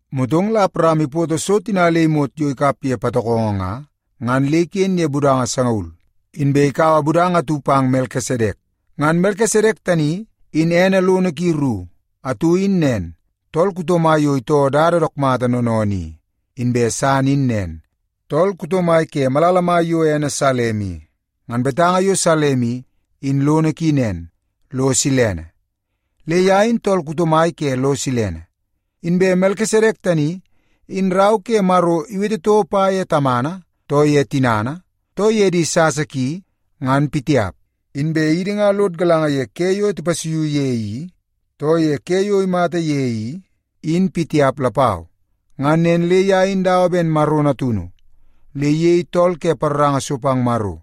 Motong la Awaram ipoto so tina le imot yo ikap ye patokongo nga, ngan le iken ye budanga sangaul, inbe ikaua budanga atu pang Melkisedek. Ngan Melkisedek tani in ene lono ki ru: atu in nen, “Tool kuto mai yo itoo dada dook mata noonoonoo i”, inbe san in nen, “Tool kuto mai ke malala mai yo ene Salem i.” Ngan betanga yo Salem i, in lono ki nen, lo silene. Le ye in tool kuto mai ke lo silene. Inbe Melkisedek tani, in Rau ke Maro iwete toko pa ye tamana, too ye tinana, too ye di sasa ki, ngan pitiap. Inbe idi nga lod galanga ye ke yo tipasuiu ye i, too ye ke yo imata ye i, in pitiap lapau. Ngan nen le ye in dawa ben Maro Natunu, le iyei tool ke paroranga so pang Maro,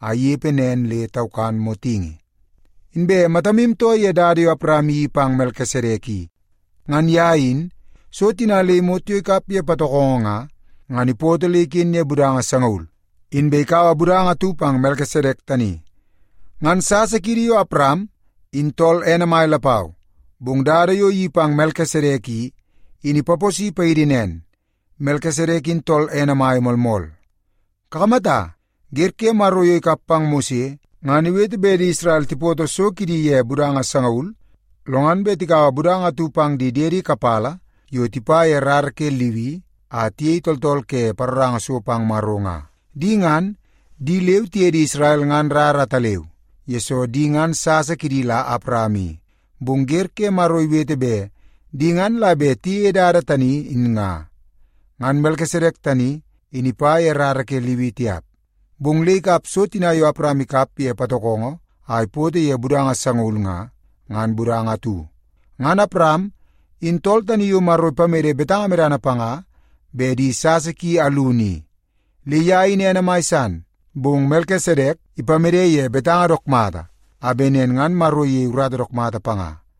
a inepe nen le taukan motingi. Inbe matamu too ye dada yo Awaram iyeii pang Melkisedek i. Ngan ye in, so tina le imot yo ikap ye patokongo nga, ngan ipoto le iken ye budanga sangaul, inbe ikaua budanga atu pang Melkisedek tani. Ngan sasa kiidi yo Awaram in tool ene mai lapau, bong dada yo iyeii pang Melkisedek i, in ipaposi paidi nen, Melkisedek in tool ene mai moolmool. Kakamata, wer ke Maro yo ikap pang Mose, ngan iwete bet di Isrel tipoto so kidi ye budanga sangaul, lo ngan bet tikaua budanga atu pang di diedi kapala yo tipa ye rara ke Liwi a tiyei tooltool ke paroranga so pang Maro nga. Di ngan, di leu tiye di Isrel nga rara ataleu, yesoo di ngan sasa kidi la Awaram i, bong wer ke Maro iwete bet di ngan la bet tiyeie dada tani in nga. Ngan Melkisedek tani, in ipa ye rara ke Liwi tiap, bong le ikap so tina yo Awaram ikap ye patokongo a ipoto ye budanga sangaul nga, ngan budanga atu. Ngan Awaram, in tool tani yo Maro ipamede betanga medana panga bet di sasa ki alunu i, le ye in ene mai san. Bong Melkisedek ipamede ye betanga dook mata a bet nen ngan Maro iyei urata dook mata panga.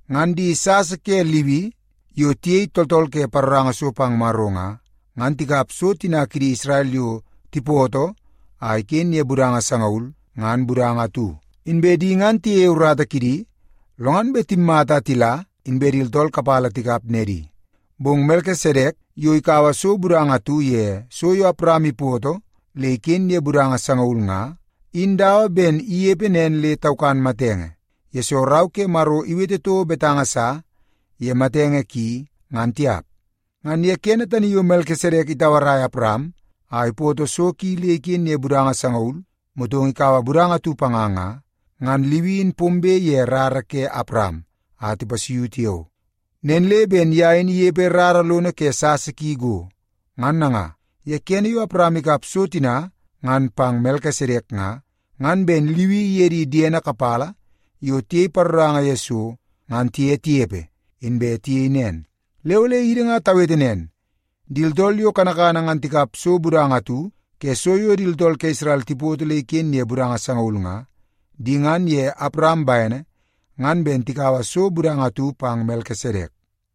Ngan di sasa ke Liwi yo tiyei tooltool ke paroranga so pang Maro nga, ngan tikap so tina kidi Isrel yo tipoto a iken ye budanga sangaul, ngan budanga atu. Inbe di ngan tiyeie urata kidi, lo ngan bet timmata a tila inbe di tooltool kapala tikap nedi. Bong Melkisedek yo ikaua so budanga atu ye so yo Awaram ipoto le iken ye budanga sangaul nga, in dawa ben inepe nen le taukan matenge, yesoo Rau ke Maro iwete toko betanga sa ye matenge ki ngan tiap. Ngan ye kene tani yo Melkisedek itauaraia Awaram a ipoto so ki le iken ye budanga sangaul motong ikaua budanga atu panga nga, ngan Liwi in pombe ye rara ke Awaram a tipasuiu tiao. Nen le ben ye in inepe rara lono ke sasa ki go. Ngan nanga, ye kene yo Awaram ikap so tina ngan pang Melkisedek nga, ngan ben Liwi iye di diene kapala yo tiyei paroranga ye so ngan tiye tinepe, inbe tiyei nen. Le ole idi nga tawete nen, di tooltool yo kanakana ngan tikap so budanga atu ke so yo di tooltool ke Isrel tipoto le iken ye budanga sangaul nga, di ngan ye Awaram bene ngan ben tikaua so budanga atu pang Melkisedek.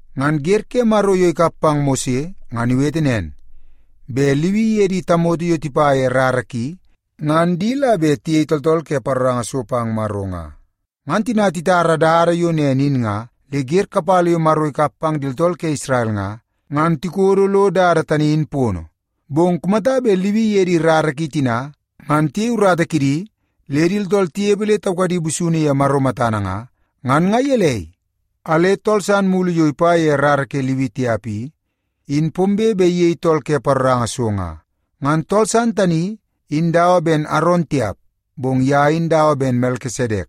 Ngan wer ke Maro yo ikap pang Mose ngan iwete nen, bet Liwi iye di tamoto yo tipa ye rara ki, ngan di la bet tiyei tooltool ke paroranga so pang Maro nga. Ngan tina itara dada yo nen in nga, le wer kapala yo Maro ikap pang di tooltool ke Isrel nga, ngan tikodo lo dada tani in pono. Bong kumata bet Liwi iye di rara ki tina ngan tiyei urata kidi le di tooltool tinepe le taukadi busunu ye Maro matana nga, ngan nga gelei a le tool san mulu yo ipa ye rara ke Liwi tiap i, in pombe bet iyei tool ke paroranga so nga? Ngan tool san tani in dawa ben Aron tiap, bong ye in dawa ben Melkisedek.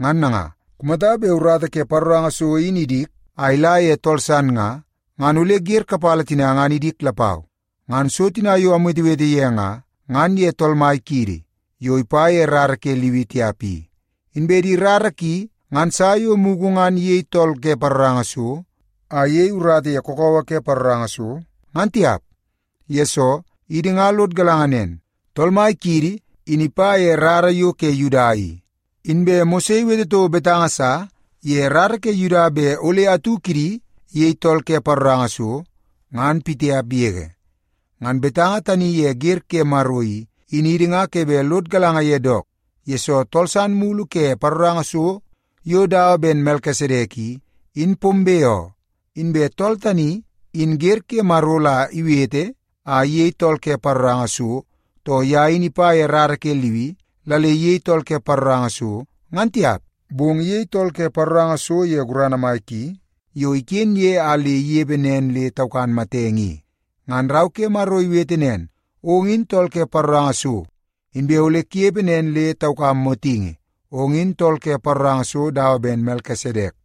Ngan nanga, kumata bet urata ke paroranga so in idik a ila ye tool san nga, ngan ole wer kapala tina ngan idik lapau. Ngan so tina yo amwetewete ye nga, ngan ye Tool Mai kiidi, yo ipa ye rara ke Liwi tiap i. Inbe di rara ki ngan sa yo mugu ngan iyei tool ke paroranga so a iyei urata ye kakawa ke paroranga so, ngan tiap. Yesoo, idi nga lod galanga nen, Tool Mai kiidi in ipa ye rara yo ke Yuda i. Inbe Mose iwete toko betanga sa ye rara ke Yuda bet ole atu kidi iyei tool ke paroranga so, ngan pitiap yege. Ngan betanga tani ye wer ke Maro i, in idi nga ke bet lod galanga ye dook, yesoo tool san mulu ke paroranga so yo dawa ben Melkisedek i, in pombe oo. Inbe tool tani, in wer ke Maro la iwete a iyei tool ke paroranga so, too ye in ipa ye rara ke Liwi la le iyei tool ke paroranga so, ngan tiap. Bong iyei tool ke paroranga so ye gurana mai ki yo iken ye a le inepe nen le taukan matenge i. Ngan Rau ke Maro iwete nen, “Ong in tool ke paroranga so inbe ole kunepe nen le taukam motingi. Ong in tool ke paroranga so dawa ben Melkisedek.”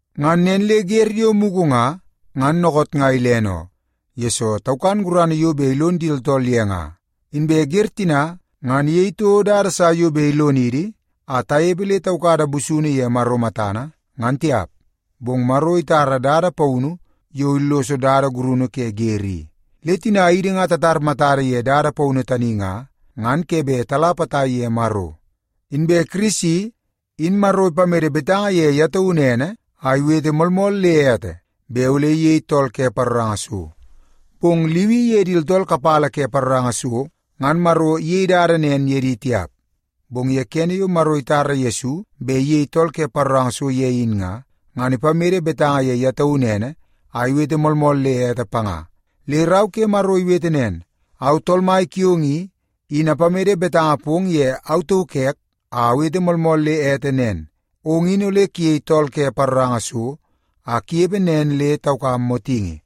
Ngan nen le wer yo mugu nga, ngan dookoot nga ilene oo, yesoo taukan gurana yo bet ilon di tooltool ye nga. Inbe wer tina ngan iyei toko dada sa yo bet ilonidi a tanepe le taukada busunu ye Maro matana, ngan tiap. Bong Maro itara dada paunu yo illoso dada gurunu ke wer i, le tina idi nga tatar matada ye dada paunu tani nga, ngan ke bet tala potai ye Maro. Inbe Kirisi, in Maro ipamede betanga ye ye taunu ene a iwete moolmool le ete bet ole iyei tool ke paroranga so. Bong Liwi iye di tooltool kapala ke paroranga so, ngan Maro iyei dada nen ye di tiap. Bong kene yo Maro itara Yesu bet iyei tool ke paroranga so ye in nga, ngan ipamede betanga ye ye taunu ene a iwete moolmool le ete panga. Le Rau ke Maro iwete nen, “Au Tool Mai kiong i, in apamede betanga pong ye au tauk ek a awete moolmool le ete nen, ‘Ong in ole kuyei tool ke paroranga so a kunepe nen le taukam motingi.’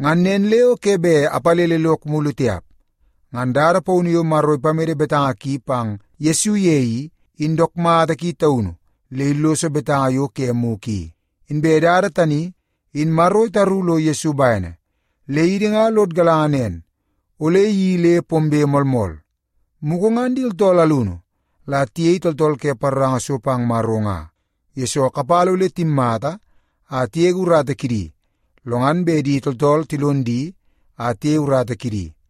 Ngan nen le o ke bet apalele lok mulu tiap.” Ngan dada paunu yo Maro ipamede betanga ki pang Yesu ye i, in dook mata ki taunu le illoso betanga yo ke mugu i. Inbe dada tani, in Maro itaru lo Yesu bene, le idi nga lod galanga nen, ole iyeii le pombe moolmool. Mugu ngan di tooltool alunu la tiyei tooltool ke paroranga so pang Maro nga, yesoo kapala ole timmata a tigege urata kidi, lo ngan bet di tooltool tilon di a tiyei urata kidi.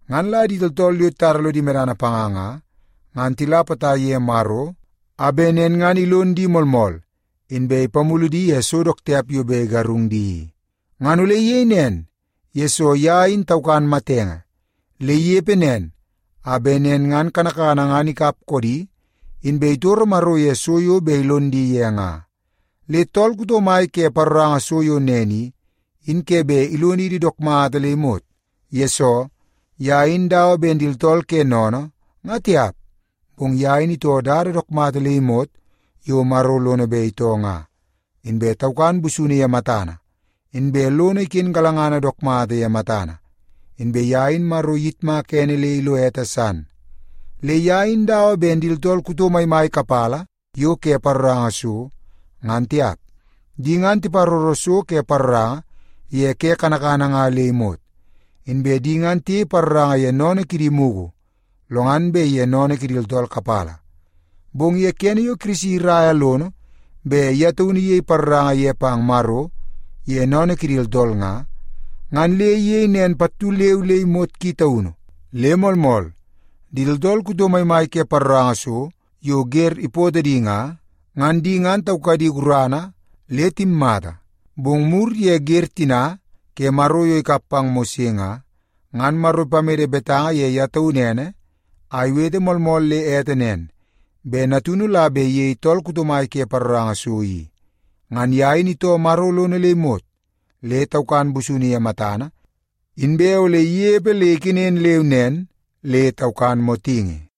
Ngan la di tooltool yo titara lodi medana panga nga, ngan tila potai ye Maro, a bet nen ngan ilon di moolmool, inbe ipamulu di ye so dook tiap yo bet igarung di i. Ngan ole iyei nen, yesoo ye in taukan matenge, le inepe nen a bet nen ngan kanakana ngan ikap koodi, inbe itoro Maro ye so yo bet ilon di ye nga. Le tool kuto mai ke paroranga so yo nen i, in ke bet ilonidi dook mata le imot. Yesoo, ye in dawa ben di tooltool ke sennene, nga tiap, bong ye in itoo dada dook mata le imot yo Maro lono bet itoo nga, inbe taukan busunu ye matana, inbe lono iken galangana dook mata ye matana, inbe ye in Maro iyitmaka ene le ilo ete san. Le ye in dawa ben di tooltool kuto maimai kapala yo ke paroranga so, ngan tiap. Di ngan tiparoro so ke paroranga ye ke kanakana nga le imot. Inbe di ngan tiyei paroranga ye sennene kidi mugu, lo ngan bet ye sennene kidi tooltool kapala. Bong kene yo Yesu iraia lono bet ye taunu iyei paroranga ye pang Maro ye sennene kidi tooltool nga, ngan le iyei nen pattu leu le imot ki taunu. Le moolmool, di tooltool kuto maimai ke paroranga so yo wer ipootoo di nga, ngan di ngan taukadi guradi le timmata. Bong mur ye wer tina ke Maro yo ikap pang Mose nga, ngan Maro ipamede betanga ye ye taunu ene a iwete moolmool le ete nen, bet Natunu la bet iyei tool kuto mai ke paroranga so i. Ngan ye in itoo Maro lono le imot, le taukan busunu ye matana, inbe ole inepe le ikenen leu nen le taukan motingi.